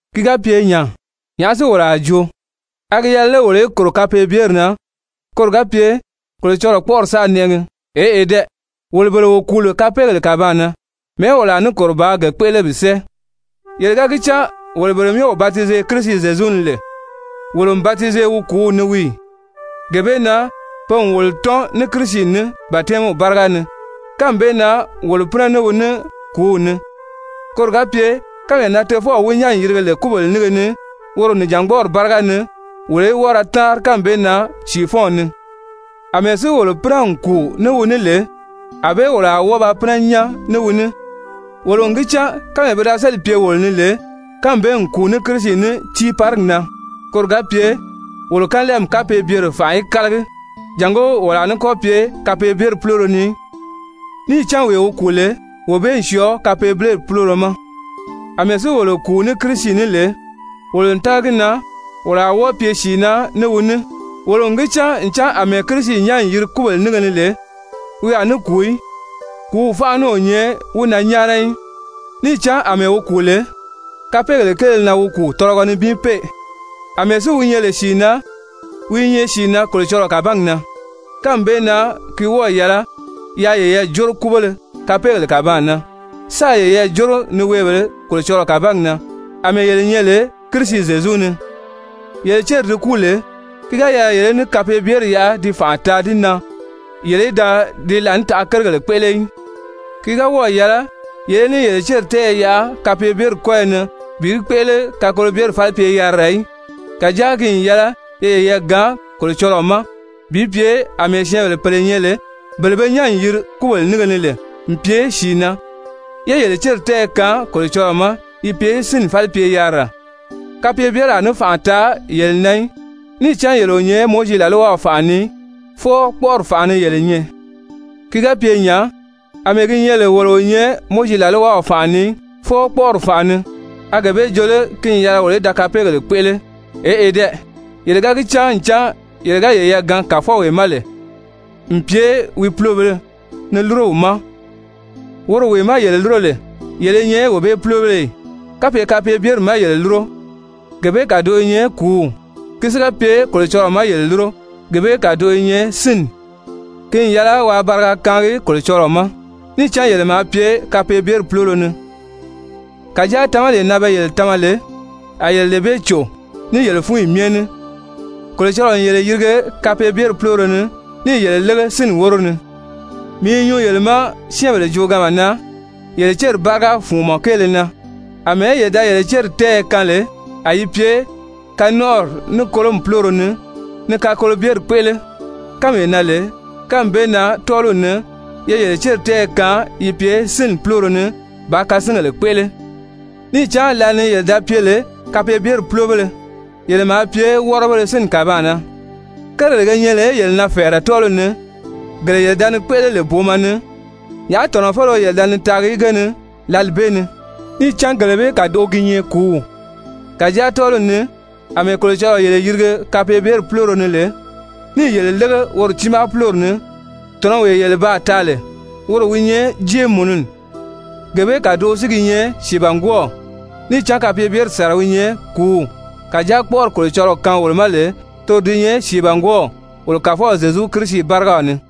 Ki ga pye nya, nyàʔá si wolo a joo? A gi yɛlɛ lé wolo í kòro kapeebyeri na, koro ga pye Kolocɔlɔɔ kpɔ́ʔɔri sáā nɛʔɛgi? Eʔe dɛ! Wolo bele wo kùu lè kapeegèle kàbaan na, mɛ̀ɛ́ wolo a ní kòro bàā ge kpéʔele bi sɛ́ɛ? Yele ga gi cán wolo bele myɛ wo batize Kirisi Zyezu ni lè, wolo n batize wi kùúw ni wii ì? Gee bee na pe n wolo tɔ́n ní Kirisi ní batɛmiw báriga ni, kánmi bee na wolo pínɛ ní wi ní kùúw ni, koro ga pye kánmee na Tofɔw wi nyán n yirige lè kúbèle nínge ni woro nìjangbɔɔri báriga ni, wolo í wɔ́ɔ ra táanri kánmi bee na sìifɔnw ni. Amɛɛ si wolo pínɛ n kùu ní wi ní lè, ànbée wolo a wɔ́ɔ ba pínɛ nyán ní wi ní. Wolo n gi cán kánmee pi da séli n pye wolo ni lè, kánmi bee n kùu ní Kirisi ní tiiparigi na, koro ga pye wolo kanlɛɛmi kapeebyere fànʔa í kálagi, jàngó wolo a ní kɔ́ pye kapeebyeri púloro ni í. Níì cán wee wi kùu lè, wee bee n syɔɔ kapeebyeri púloro ma. Amɛɛ si wolo kùu ní Kirisi ní lè, wolo n tága gi na wolo a wɔ́ɔ pye sìi na ní wi ní. Wolo n gi cán ncan àmɛɛ Kirisi nyán n yiri kúbèle nínge ni lè, wi a ní kùu í, kùúw fánʔa ní o nyɛ wi na nyáana í. Níì cán àmɛɛ wi kùu lè, kapeegèle kéele na wi kùu tɔlɔgɔ nibin pee, àmɛɛ si wi nyɛ lè sìi na, wi i nyɛ sìi na Kolocɔlɔɔ kàbangi na. Kánmi bee na ki wɔ́ɔ̀ yɛlɛ yaa yeyɛɛ jóro kúbéle kapeegèle kàbaan na, sáā yeyɛɛ jóro niweebèlē Kolocɔlɔɔ kàbangi na àmɛɛ yele nyɛ lè Kirisi Zyezu ni. Yele céri di kúu lè, ki ga yɛlɛ yele í ní kapeebyeri yaʔa ti fànʔa taa di na yele í da di laànitaʔa kérigèle kpéʔele í. Ki ga wɔ́ɔ̀ yɛlɛ yele í ní yele céri tɛ́ɛyɛ yaʔa kapeebyeri kɔ́yɔ ni bi yi kpéʔele kakolobyeri falipye-yarira í. Kàjáa ki n yɛlɛ ye yeyɛɛ gaan Kolocɔlɔɔ ma bi pye àmɛɛ syɛ́ɛnbèle pèle nyɛ lè, bele be nyán n yiri kúbèle nínge ni lè n pye sìi na, yé yele céri tɛ́ɛyɛ kaan Kolocɔlɔɔ ma yi pye sínni falipye-yarira. Kapeebyeri a ní fànʔa taa yele na í, níì cán yele o nyɛ Mowizi làlwaw fànʔa ni í, fwɔɔ kpɔ́ʔɔri fànʔa ni yele nyɛ. Ki ga pye nya, àmɛɛ gi nyɛ lè wolo o nyɛ Mowizi làlwaw fànʔa ni í, fwɔɔ kpɔ́ʔɔri fànʔa ni, a gee bee jo lé ki n yɛlɛ wolo í da kapeegèle kpéʔele? Eʔe dɛ! Yele ga gi cán ncan yele ga yeyɛɛ gaan kàfɔwee ma lè n pye wi pulobèlē ni lúro wi ma, woro wee má yele lúro lè, yele i nyɛ wee bee púlobéle ì? Kapye kapeebyeri má yele lúro, gee bee kàdoʔo i nyɛ kùúw, ki si ga pye Kolocɔlɔɔ má yele lúro, gee bee kàdoʔo i nyɛ sínni. Ki n yɛlɛ waa bariga kaangi Kolocɔlɔɔ ma, níì cán yele maa pye kapeebyeri púloro ni, kàjáa tamalee na pe yele tama lè, a yele lee bee cò ní yele fúnyi myɛ ní. Kolocɔlɔɔ n yele yirige kapeebyeri púloro ni níì yele lége sínni wóro ni. Mii i nyuu yele ma syɛ́ɛnbèle jooganma na yele céri báriga fùnmɔ kéele na. Amɛɛ yele da yele céri tɛ́ɛyɛ kaan lè a yi pye kanɔnʔɔri ní kolomi púloro ni ni kakolobyeri kpéʔele kánmee na lè, kánmi bee na tɔ́ɔliw ni, ye yele céri tɛ́ɛyɛ kaan yi pye sínni púloro ni bàā kasingèle kpéʔele. Níì cán lǎli ni yele da pye lè kapeebyeri púlobéle, yele maa pye wɔ́rɔbéle sínni kàbaan na. Kérigèle ge nyɛ lè yele na fɛ̀ɛrɛ tɔ́ɔliw ni, gele yele da ni kpéʔele lè booma ni, nyàʔá tɔ̀nɔfeleo yele da ni taagi ge ni lǎli bee ni? Níì cán gele bee kàdoʔo gi nyɛ kùúw. Kàjáa tɔ́ɔliw ni, àmɛɛ Kolocɔlɔɔ yele yirige kapeebyeri púloro ni lè, níì yele lége woro tiimaa púlori ni, tɔ̀nɔwee yele baa taa lè, woro wi nyɛ jéemununi, gee bee kàdoʔo si gi nyɛ sìibangwɔɔw. Níì cán kapeebyeri sàra wi nyɛ kùúw, kàjáa kpɔ́ʔɔri Kolocɔlɔɔ kaan wolo ma lè, toro di nyɛ sìibangwɔɔw wolo Kàfɔw Zyezu Kirisi bárigaw ni.